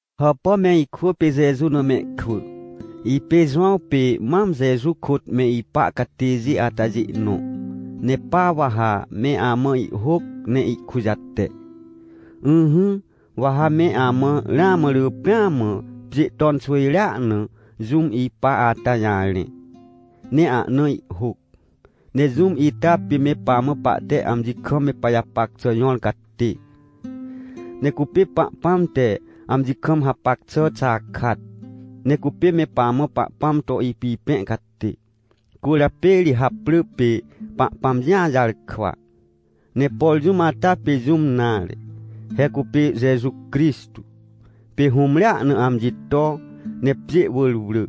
Hàpà me ikwỳ pê Jeju na mehkwỳ, ipê Jowãw pê mam Jeju kôt me ipa catêjê atajê nõ. Ne pa wa ha me amã ihhôc ne ihkujate. Ỹhỹ, wa ha me amã ramã rỳ pêa mã pjê ton xwỳjrea na jũm ipa ata jarẽ, ne ahna ihhôc. Ne jũm ita pê me pamã pahte amji kam me pajapac xà jõr catê. Ne cupê Pahpãm te amji kam hapac xà xakat. Ne cupê me pamã Pahpãm to ipipẽ catê. Cwỳrjapê ri haprỳ pê “Pahpãm Jĩa Jarkwa”. Ne por jũm ata pê jũm nare, he cupê Jeju Crixtô. Pê hũmrea na amji to, ne pjê wỳr wrỳ,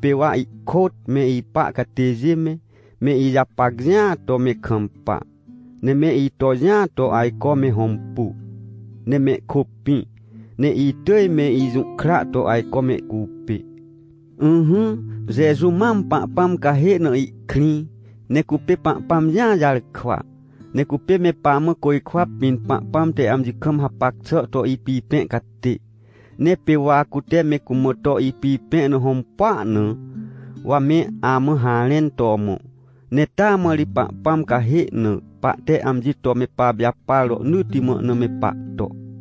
pê wa ihkôt me ipa catêjê me, me ijapac jĩa to me kampa, ne me ito jĩa to ajco me hõmpu, ne mehkôpĩ, ne itỳj me ijũhkra to ajco mehcupê. Ỹhỹ, Jeju mam Pahpãm cahê na ihkrĩ, ne cupê Pahpãm Jĩa Jarkwa, ne cupê me pamã côjkwa pĩn Pahpãm te amji kam hapac xà to ipipẽ catê, ne pê wa cute me cumã to ipipẽ na hõmpua na, wa me amã harẽn to mõ. Ne taa mã ri Pahpãm cahê na pahte amji to me papijapar rohnỳtti mã na me pahto.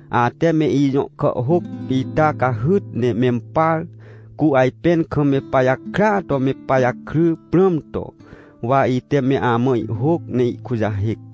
Ate me ijõ kàhhôc ita cahyt ne mempar, cu ajpẽn kam me pajakrya to me pajakry prãm to, wa ite me amã ihhôc ne ihkujahêc.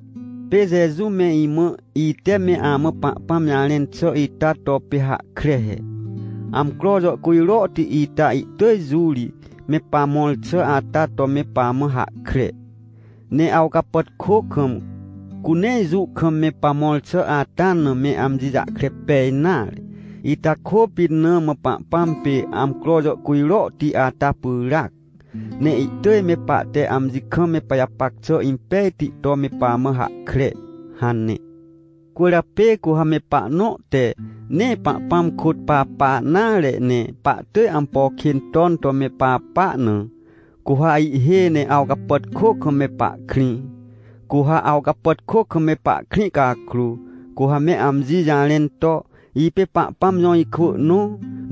Pê Jeju me imã, ite me amã Pahpãm jarẽn xà ita to pê hahkre he: — Amcro jàhcujrohti ita ihtỳj jũ ri me pamõr xà ata to me pamã hahkre, ne awcapàtkô kam, cu nee jũ kam me pamõr xà ata na me amji jahkre pej nare. Ita kôpit na mã Pahpãm pê amcro jàhcujrohti ata pyràac, ne ihtỳj me pahte amji kam me pajapac xà impejti to me pamã hahkre — hane. Cwỳrjapê cu ha me pahnõ te nee Pahpãm kôt papa nare, ne pahtỳj ampo kên ton to me papa na, cu ha ihhêj ne awcapàtkô kam me pahkrĩ. Cu ha awcapàtkô kam me pahkrĩ cakrô, cu ha me amji jarẽn to: — Ipê Pahpãm jõ ikwỳ nõ,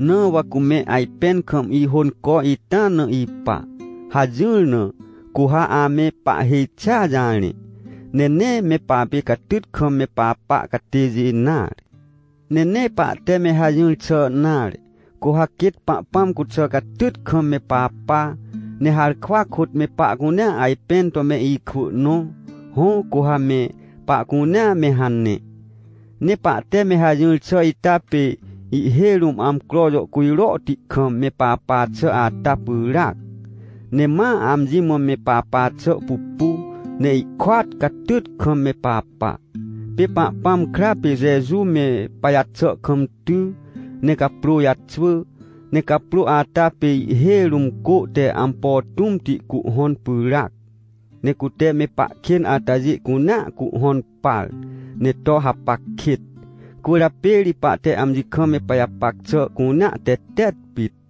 na wa cume ajpẽn kam ihônco ita na ipa — hajỹr na, cu ha ame pahhêj xia jarẽ, ne nee me papê catyt kam me papa catêjê nare. Ne nee pahte me hajỹr xà nare, cu ha quêt Pahpãm cuxà, catyt kam me papa, ne harkwa kôt me pahcunea ajpẽn to me ikwỳ nõ. Hõ, cu ha me pahcunea me hane, ne pahte me hajỹr xà ita pê ihhêj rũm amcro jàhcujrohti kam me papa xà ata pyràac, ne ma amji mã me papa xà pupu ne ihkôat, catyt kam me papa. Pê Pahpãm kra pê Jeju me pajaxà kam ty, ne caprô jaxwỳ, ne caprô ata pê ihhêj rũm cô te ampo tũmti cuhhõn pyràac. Ne cute me pahkên atajê cunea cuhhõn par ne to hapac kêt. Cwỳrjapê ri pahte amji kam me pajapac xà cunea tetet pit.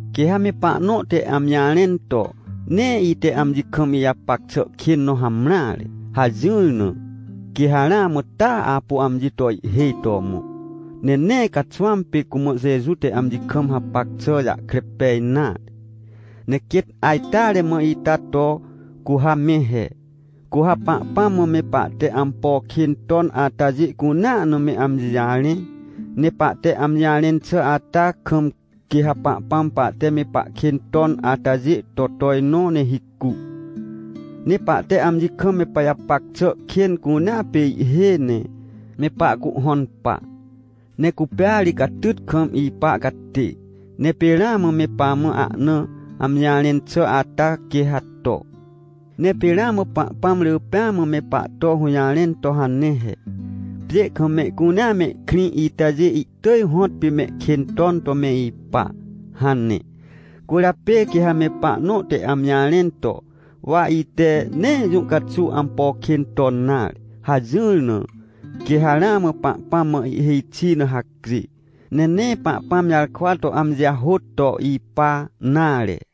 Quê ha me pahnõ te amji jarẽn to: — Nee ite amji kam ijapac xà kên nõ hamreare — hajỹr na, quê ha ramã taa apu amji to ihhêj to mõ, ne nee caxwãm pê cumã Jeju te amji kam hapac xà jahkre pej nare. Ne quêt ajteare mã ita to, cu ha me he. Cu ha Pahpãm mã me pahte ampo kên ton atajê cunea na me amji jarẽ. Ne pahte amji jarẽn xà ata kam, quê ha Pahpãm pahte me pahkên ton atajê to tojnõ ne hicu, ne pahte amji kam me pajapac xà kên cunea pê ihhêj ne me pahcuhhõn pa. Ne cupêa ri catyt kam ipa catê, ne pê ramã me pamã ahna amji jarẽn xà ata, quê ha to. Ne pê ramã Pahpãm rỳ pêa mã me pahto hũjarẽn to hane he: — Pjê kam mehcunea mehkrĩ itajê ihtỳj hõtpê mehkên ton to me ipa — hane. Cwỳrjapê quê ha me pahnõ te amji jarẽn to: — Wa ite nee jũ caxuw ampo kên ton nare — hajỹr na, quê ha ramã Pahpãm mã ihhêj xi na hacjê, ne nee Pahpãm jarkwa to amji jahôt to ipa nare.